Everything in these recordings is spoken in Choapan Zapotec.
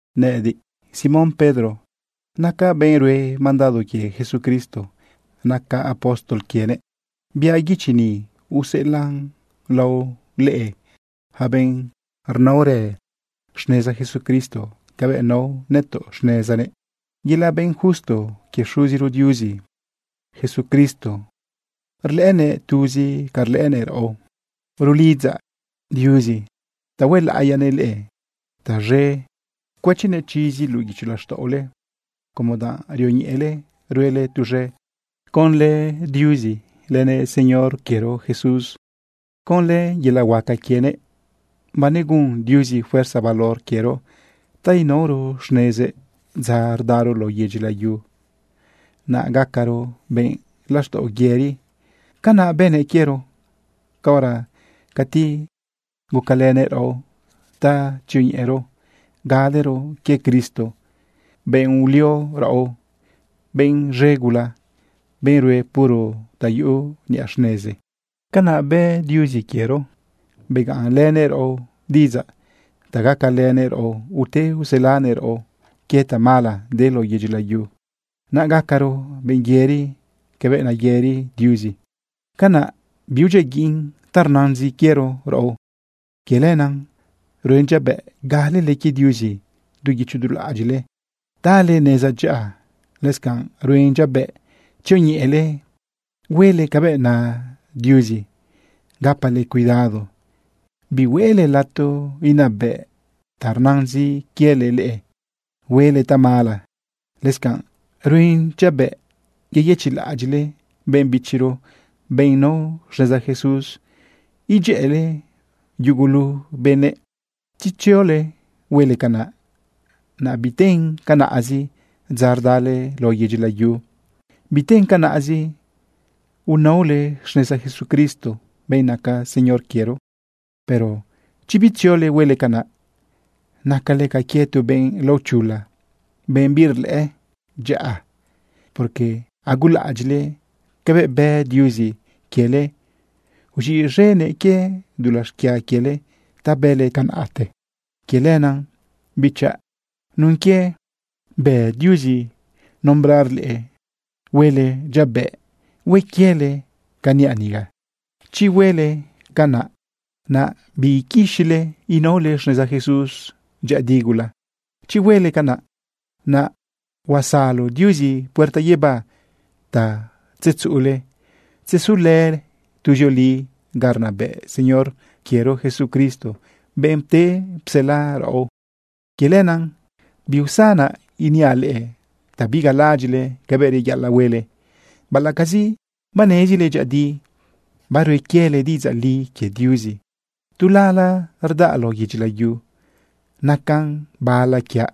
Nëꞌëdiꞌ, Simón Pedro, nacaꞌ benꞌ rue mandado quie Jesucristo. Nacaꞌ apóstol quienëꞌ. Biaꞌ guichi ni useꞌelaꞌn lao leꞌe, yaca benꞌ rnaorë xneza Jesucristo cabëꞌ nao nëtoꞌ xnezanëꞌ. Yelaꞌ benꞌ justo quie Xuziro Diuzi Jesucristo rlëꞌënëꞌ tuzi ca rlëꞌënëꞌ raꞌo. Rulidzaꞌ Diuzi ta huelaꞌiyanëꞌ leꞌe taz̃e cuëchinëꞌ chizi luꞌu guicho laxtaꞌole como danꞌ rioñeꞌele ruele tuz̃e conlë Diuzi lënëꞌ Señor quiero Jesús. Conlë yelaꞌ huaca quienëꞌ, banegun Diuzi fuerza valor quiero ta inaoro xnezëꞌ dza rdaro lao yedyi layu, naꞌ gacaro benꞌ laxtaꞌo yëri. Canaꞌ bënëꞌ quiero caora cati gucalënëꞌ raꞌo ta tzioñeꞌero galero quie Cristo, benꞌ ulio raꞌo, benꞌ z̃e gula, benꞌ rue puro ta yuꞌu niꞌa xnezi. Canaꞌ bë Diuzi quiero begaꞌn lënëꞌ raꞌo diꞌidzaꞌ ta gacalënëꞌ raꞌo ute uselanëꞌ raꞌo quie tamala de lao yedyi layu, naꞌ gacaro benꞌ yëri cabëꞌ nayëri Diuzi. Canaꞌ biudyiaguiꞌn ta rnazin quiero raꞌo. Quie lenaꞌ ruen dyabëꞌ galele quie Diuzi du guicho du laꞌadyiꞌle tale neza dyaꞌa. Lëscanꞌ ruen dyabëꞌ tzioñeꞌele huele cabëꞌ na Diuzi gapale cuidado bihueꞌle lato inabëꞌ ta rnazin quiele leꞌe huele tamala. Lëscanꞌ ruen dyabëꞌ yeyëchiꞌlaꞌadyiꞌle benꞌ bichiro, benꞌ nao xneza Jesús, idyëꞌële yugulu benëꞌ. Chi tziole huele canaꞌ, naꞌ biten canaꞌzi dza rdale lao yedyi layu, biten canaꞌzi unaole xneza Jesucristo, benꞌ naca Señor quiero. Pero chi bitziole huele canaꞌ, nacale ca quie tu benꞌ laochula, benꞌ birlëꞌë dyaꞌa, porque agulaꞌadyiꞌle cabëꞌ bë Diuzi quiele uz̃iꞌz̃enëꞌ quie dulaꞌ xquia quiele ta bële tiempote. Quie lenaꞌ, bichaꞌ, nun quie bë Diuzi nombrar leꞌe, huele dyabëꞌ hue quiele ca niaꞌ niga. Chi huele canaꞌ, naꞌ biiquixile inaole xneza Jesús dyëꞌëdi gula. Chi huele canaꞌ, naꞌ huesalo Diuzi puerta guibá ta tzetzuꞌule tzesule tuzioli ga rnabëꞌ Señor quiero Jesucristo, benꞌ pte psela raꞌo. Quie lenaꞌ biusanaꞌ iniaꞌ leꞌe ta bigalalaꞌadyiꞌle cabëꞌ reyaꞌalaꞌ huele, baꞌalaꞌcazi banezile dyëꞌëdi barue quiele diꞌidzaꞌ li quie Diuzi. Tu lala rdaꞌ lao yedyi layu, nacan bala quiaꞌ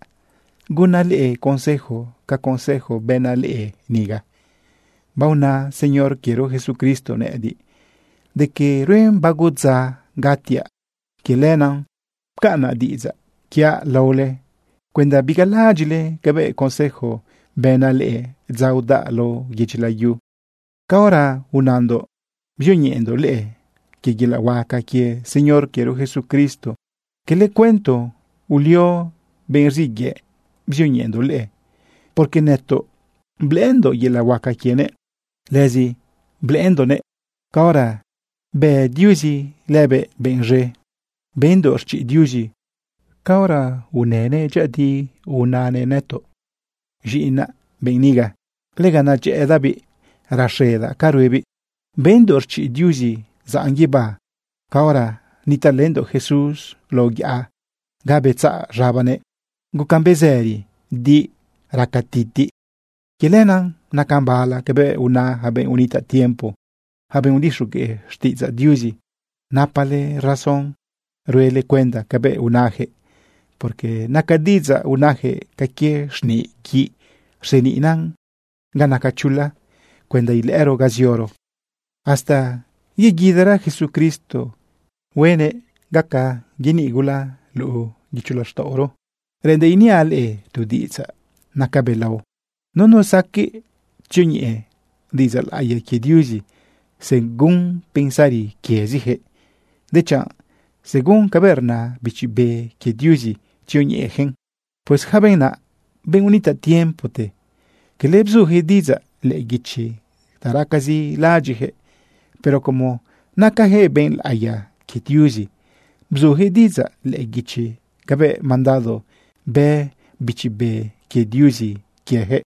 gunaꞌ leꞌe consejo ca consejo bënaꞌ leꞌe niga. Baona Señor quiero Jesucristo nëꞌëdiꞌ de que ruen bago dza gatiaꞌ. Quie lenaꞌ pcaꞌnaꞌ diꞌidzaꞌ quiaꞌ laole cuenda bigalaꞌadyiꞌle cabëꞌ consejo bënaꞌ leꞌe dza udaꞌ lao yedyi layu. Caora unandoꞌ bzioñeꞌendoꞌ leꞌe quie yelaꞌ huaca quie Señor quiero Jesucristo, quele cuento ulio benꞌ rziꞌ yëꞌ bzioñeꞌendoꞌ leꞌe, porque nëtoꞌ blëꞌëndoꞌ yelaꞌ huaca quienëꞌ. Lëzi blëꞌëndoꞌnëꞌ caora bë Diuzi lëbëꞌ benꞌ z̃e. Bendoꞌ rchiꞌ Diuzi caora unënëꞌ dyëꞌëdi nanëꞌ nëtoꞌ: “Z̃iꞌinaꞌ benꞌ niga. Lega nedyëꞌëdaꞌbiꞌ raxedaꞌ ca ruebiꞌ.” Bendoꞌ rchiꞌ Diuzi zaꞌn guibá caora nitaꞌlëndoꞌ Jesús lao yaꞌa ga betzaꞌ z̃abanëꞌ gucan bezëri di raca titiꞌ. Quie lenaꞌ nacan bala cabëꞌ una yaca benꞌ unitaꞌ tiempo, yaca benꞌ udixogueꞌ xtiꞌidzaꞌ Diuzi. Napale razón ruele cuenda cabëꞌ unajëꞌ, porque naca diꞌidzaꞌ unajëꞌ ca quie xniꞌ guiꞌ rseniꞌna ga naca chula cuenda ilëꞌëro ga zioro hasta yeguidara Jesucristo huenëꞌ gaca yeniꞌ gula luꞌu guicho laxtaꞌoro. Reꞌendaꞌ iniaꞌ leꞌe tu diꞌidzaꞌ naca belao. Nunu saqueꞌ tzioñeꞌe diꞌidzaꞌ laꞌiya quie Diuzi según pensari quieziyaquëꞌ, dechanꞌ según cabëꞌ rna Bichi Be quie Diuzi tzioñeꞌeyaquëꞌn. Pues yaca benꞌ naꞌ, benꞌ unitaꞌ tiempote, quele bzujëꞌ diꞌidzaꞌ lëꞌë guichi ta racazi laꞌadyiꞌjëꞌ, pero como nacajëꞌ benꞌ laꞌiya quie Diuzi, bzujëꞌ diꞌidzaꞌ lëꞌë guichi cabëꞌ mandado bë Bichi Be quie Diuzi quieyaquëꞌ.